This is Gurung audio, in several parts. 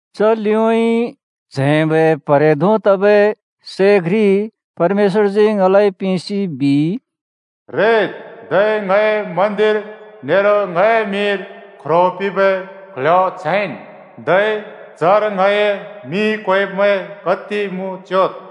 च लिउँइँ च्हैंबै प्हरे धों तबै सै घ्रि परमेश्‍वरजी ङलाइ पिंसि बिइ, “रेद्, धै ङए मन्‍दिर नेरो ङए मिंर ख्रो पिंबै क्ल्ह्‍यो च्हैंन्, धै चर ङए मिं क्वेब्मैं कति मुँ च्‍योद्।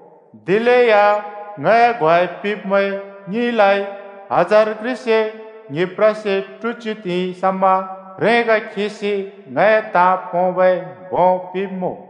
दिलेया ङए ग्वाइ पिंब्‍मैं ङ्हिंलाइ हजार घ्रिसे ङ्हिप्रसे ट्हुच्‍यु त्हिंइ समा ह्रेंग खिसि ङए ताँ पोंबै भों पिंब्‍मुँ।”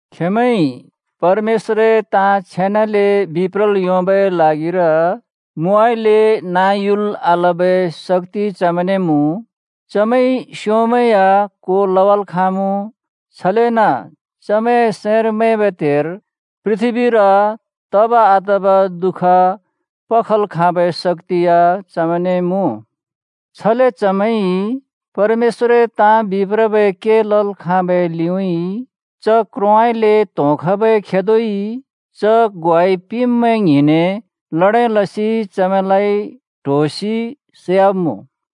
खेंमैंइ परमेश्‍वरए ताँ छेनाले बिप्रल् योंबै ल्हागिर मुउँइँले नाँ युल् आलबै शक्‍ति चमैंने मुँ, चमैंइ स्योंमैं या को लवाल् खाँमुँ, छलेन चमैंए सैंर मैंबै त्हेर पृथ्‍बीर तब आतब दुःख पल् खाँबै शक्‍ति या चमैंने मुँ। छले चमैंइ परमेश्‍वरए ताँ बिप्रबै के लल् खाँबै लिउँइँ च क्रोंउँइँले त्होंखबै खेदोइ च ग्वाइ पिंब्‍मैं ङ्हिंने ल्हडें लसि चमैंलाइ ट्होसि सैवाब्‍मुँ।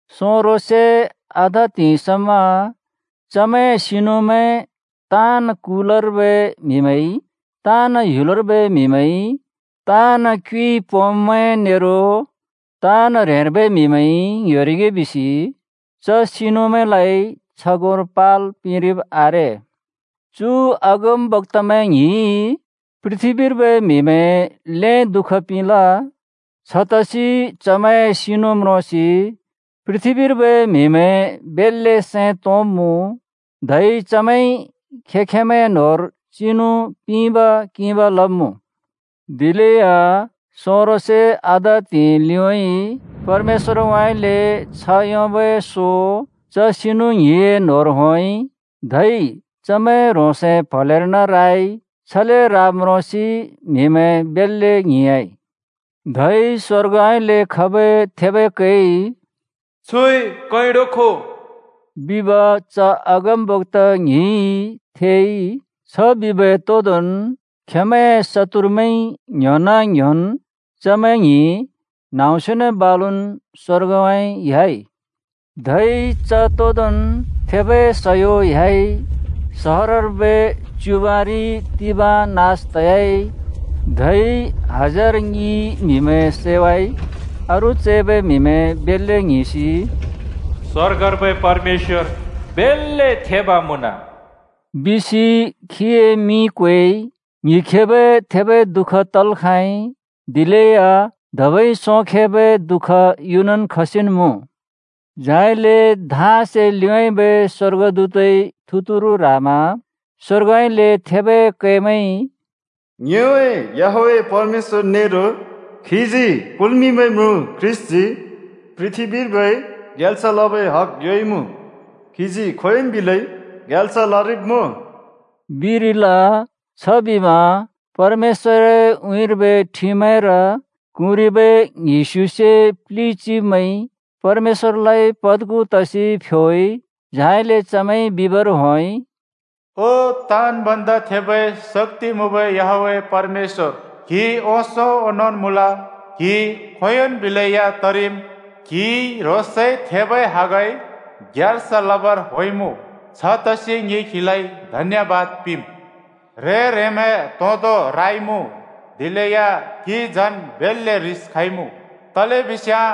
सोंरो से आधा त्हिंइ समा चमैंए सिनुमैं ताँन् कुलर्बै म्‍हिमैंइ, ताँन् ह्‍युलर्बै म्‍हिमैंइ, ताँन् क्युइ पोंब्‍मैंइ नेरो ताँन् ह्रेंर्बै म्‍हिमैंइ ङ्ह्‍योरिगे बिसि च सिनुमैंलाइ छगोंर पाल् पिंरिब् आरे। चु अगमबक्‍तामैं ङ्हिंइ पृथ्‍बीर्बै म्‍हिमैं ल्हें दुःख पिंल। छतसि चमैंए सिनु म्रोंसि पृथ्‍बीर्बै म्‍हिमैं बेल्‍ले सैं तोंब्‍मुँ, धै चमैंइ खें-खेंमैंए न्होंर चिनु पिंब-किंब लब्‍मुँ। दिलेया सोंरो से आधा त्हिंइ लिउँइँ परमेश्‍वरउँइँले छ्ह योंबै सो च सिनु ङ्हिंए न्‍होंर होंइ। धै चमैं ह्रोंसए प्हलेर्न राइ। छले राब् म्रोंसि म्हिमैं बेल्‍ले ङ्हिंयाँइ। धै स्‍वर्गउँइँले खबै थेबै कैइ “छुइ कैंडो खो!” बिब च अगमबक्‍ता ङ्हिंइ थेइ। छ बिबै तोंदोंन् खेंमैंए शत्तुरमैंइ ङ्‍ह्‍योन-ङ्‍ह्‍योन् चमैं ङ्हिं न्‍हाँम्‍स्योने बालुन् स्‍वर्गउँइँ ह्‍याइ। धै च तोंदोंन् थेबै सयो ह्‍याइ, सहरर्बै च्‍युबाँरि तिबाँ नास तयाइ, धै हजार ङि म्हिमैं सैवाइ। अरू चैबै म्‍हिमैं बेल्‍ले ङ्हिंसि “स्‍वर्गर्बै परमेश्‍वर बेल्‍ले थेब मुँन!” बिसि खीए मिं क्वेइ। ङ्हिंखेबै थेबै दुःख तल् खाँइ, दिलेया धबै सोंखेबै दुःख युनन् खसिन् मुँ। झाइले धाँसे लिउँबै स्‍वर्गदूतइ थुतुरु ह्रामा स्‍वर्गउँइँले थेबै कैमैंइ “ङ्योए याहवेह परमेश्‍वर नेरो खीजी कुल्मिंबै म्रुँ ख्रीष्‍टजी पृथ्‍बीर्बै ग्याल्स लबै हग योंइमुँ। खीजी खोंयोंन् बिलै ग्याल्स लरिब्‍मुँ,” बिरिल। छबिमा परमेश्‍वरए उँइँर्बै ठिमैंर क्हुँरिबै ङ्हिस्युसे प्लि चिब्मैंइ परमेश्‍वरलाइ पद्खु तसि फ्‍योइ। झाइले चमैंइ बिबर होंइ, “ओ ताँन् भन्दा थेबै शक्‍ति मुँबै याहवेह परमेश्‍वर, क्‍हि ओंसों ओंनोंन् मुँल, क्हि खोंयोंन् बिलै या तरिम्। क्‍हिइ ह्रोंसए थेबै हगइ ग्याल्स लबर होंइमुँ। छतसि ङि क्हिलाइ धन्‍यबाद पिंम्। ह्रें-ह्रेंमैं त्होंदो राइमुँ, दिलेया क्‍हि झन् बेल्‍ले ह्रिस खइमुँ, तलेबिस्याँ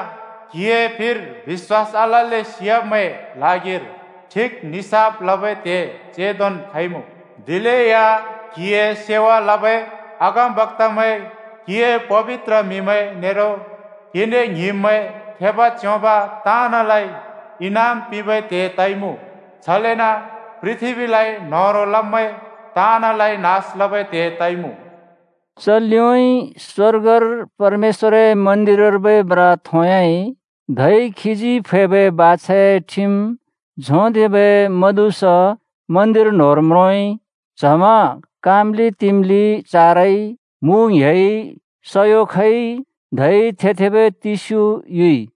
क्हिए फिर बिश्‍वास आलल्‍ले सियाब्‍मैंए ल्हागिर ठिक निसाफ लबै त्हे चेंदोन् खइमुँ। दिलेया क्‍हिए सेवा लबै अगमबक्‍तामैं, क्‍हिए पबित्र म्‍हिमैं नेरो क्‍हिने ङ्हिंब्‍मैं, थेब, च्‍योंब ताँनलाइ, इनाम पिंबै त्हे तइमुँ। छलेन पृथ्‍बीलाइ न्होह्रों लब्मैं ताँनलाइ नास लबै त्हे तइमुँ।” च लिउँइँ स्वर्गर परमेश्‍वरए मन्‍दिरर्बै म्रा थोंयाइ, धै खीजी फैबै बाछाए ठिम झोंथेंबै म्हदुस मन्‍दिर न्होंर म्रोंइ। च्हमा काम्‍लि तिम्‍लि चारइ, मु ङ्‌हेइ, सयो खइ धै थे-थेबै तिस्‍यु युइ।